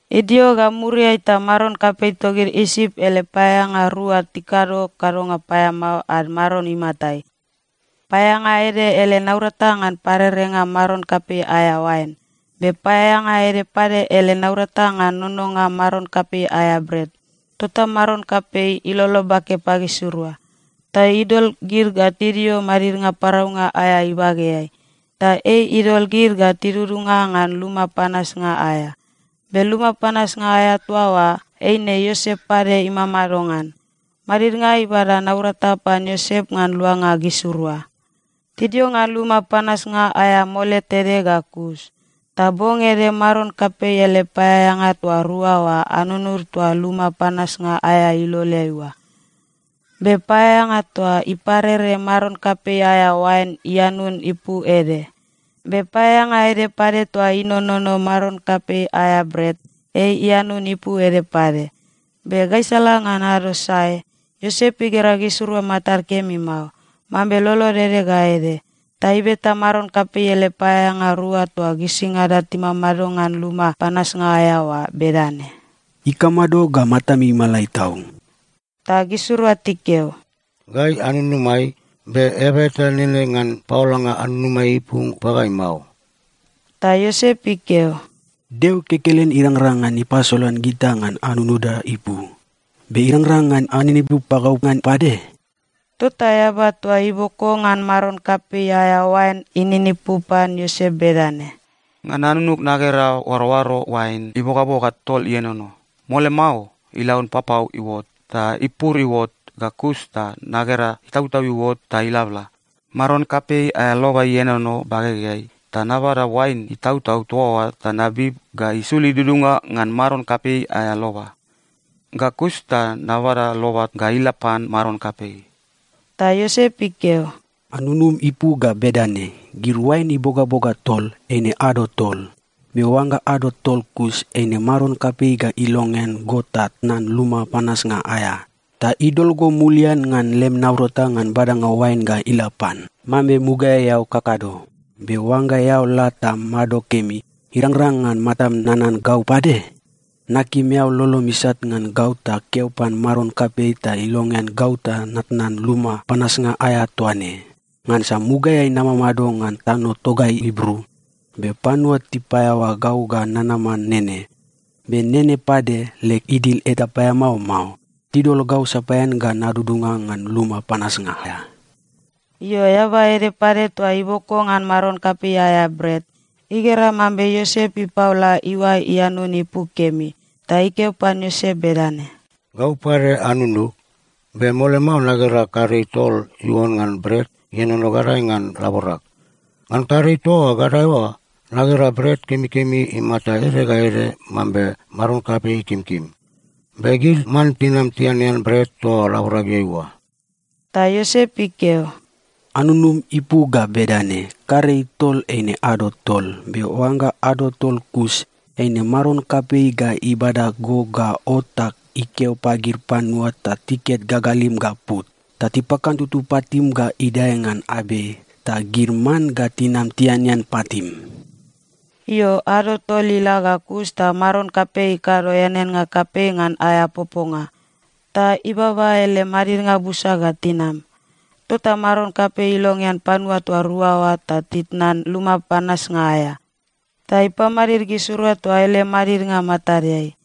Idio ga muriai ta maron kapei togid Isip ele paeaeanga rua tikado kadonga paeamao ad maron imatai. Paeaeanga ede ele naurata ngan parerenga maron kapei aea oain. Be paeaeanga ede pade ele naurata ngan nononga maron kapei aea bret. Tota maron kapei ilolo bake pagisirua ta idol gid ga tidio madidnga paraunga aea ibageai, ta ei idol gid ga tidudunga ngan luma panasnga aea. Be luma panasnga aea toa oa eine Iosep pade imamado ngan. Madidnga ibada naurata pan Iosep ngan luanga gisirua. Tidio ngan luma panasnga aea mole tede ga kus, ta bong ede maron kapei ele paeaeanga toa rua oa anunud toa luma panasnga aea iloleai oa. Be paeaeanga toa iparere maron kapei aea oain ianun ipu ede, be paeaeanga ede pade toa inonono maron kapei aea bret, ei ianun ipu ede pade. Be gaisala ngan ado sae, Iosep igera gisirua matad kemi mao, mambe lolod ede ga ede. Ta ibeta maron kapei ele paeaeanga rua toa gisingada timamado ngan luma panasnga aea oa bedane, “Ikamado ga matami imalai tau?” Ta gisirua tikeo, “Gai anunumai, be eaba eta nene ngan paolanga anunumai ipu pagai mao.” Ta Iosep ikeo, “Deo kekelen irangrang ngan ipasolan gita ngan anunuda ipu. Be irangrang ngan aninipu pagau ngan pade?” Tota eaba toa iboko ngan maron kapei aea oain ininipu pan Iosep bedane, “Ngan anunug nagera oaroaro oain ibogaboga tol ienono. Mole mao ilaun papau iuot, ta ipur iuot, ga kus ta nagera itautau iuot ta iblabla. Maron kapei aea loba ienono bagegeai ta nabada oain itautau toa oa ta nabib ga isul idudunga ngan maron kapei aea loba. Ga kus ta nabada loba ga ila pan maron kapei.” Ta Iosep ikeo, “Anunum ipu ga bedane: Gid oain ibogaboga tol, eine ado tol. Be oangga ado tol kus, eine maron kapei ga ilongean go ta tnan luma panasnga aea, ta idol go mulian ngan lem naurata ngan badanga oain ga ila pan, mambe mugaeai eao kakado. Be oangga eao la ta mado kemi, irangrang ngan matam nanan gau pade? Nakim eao lolom isat ngan gau ta keo pan maron kapei ta ilongean gau ta natnan luma panasnga aea toa ne. Ngansa mugaeai namamado ngan tano togai Ibru, be panua tipaeaoa gau ga nanama nene. Be nene pade, leg idil eta paeamao mao. Tidol gau sapaean ga nadudunga ngan luma panasnga aea.” Io, eaba ede pade toa iboko ngan maron kapei aea bret, igera mambe Iosep ipaola iuae ianun ipu kemi, ta ikeo pan Iosep bedane, “Gau pade anunug, be mole mao nagera karei tol iuon ngan bret ienono gadae ngan laborag. Ngan karei toa gadae oa, nagera bret kemikemi imata ede ga ede mambe maron kapei ikimkim. Be gid man tinam tianean bret toa laborageai oa.” Ta Iosep ikeo, “Anunum ipu ga bedane: Karei tol eine ado tol. Be oangga ado tol kus, eine maron kapei ga ibada go ga ot ta ikeo pagid panua ta tiket gagalim ga put, ta tipakantutu patim ga idae ngan abei. Ta gid man ga tinam tianean patim.” Io, ado tol ila ga kus ta maron kapei ikado eaneannga kapei ngan aea poponga, ta ibaba ele madidnga busa ga tinam. Tota maron kapei ilongean panua toa rua oa ta titnan luma panasnga aea, ta ipamadid gisirua toa ele madidnga matadeai.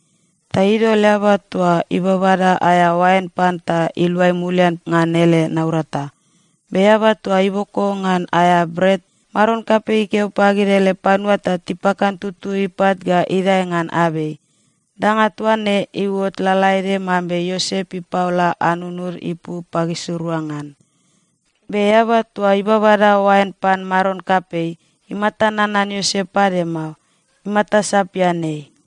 Ta idol eaba toa ibabada aea oain pan ta iluai mulian ngan ele naurata. Be eaba toa iboko ngan aea bret, maron kapei ikeo pagid ele panua ta tipakantutu ipat ga idae ngan abei. Danga toa ne iuot lalaede mambe Iosep ipaola anunud ipu pagisirua ngan. Be eaba toa ibabada oain pan maron kapei, imata nanan Iosep pade mao. Imata sapian ei.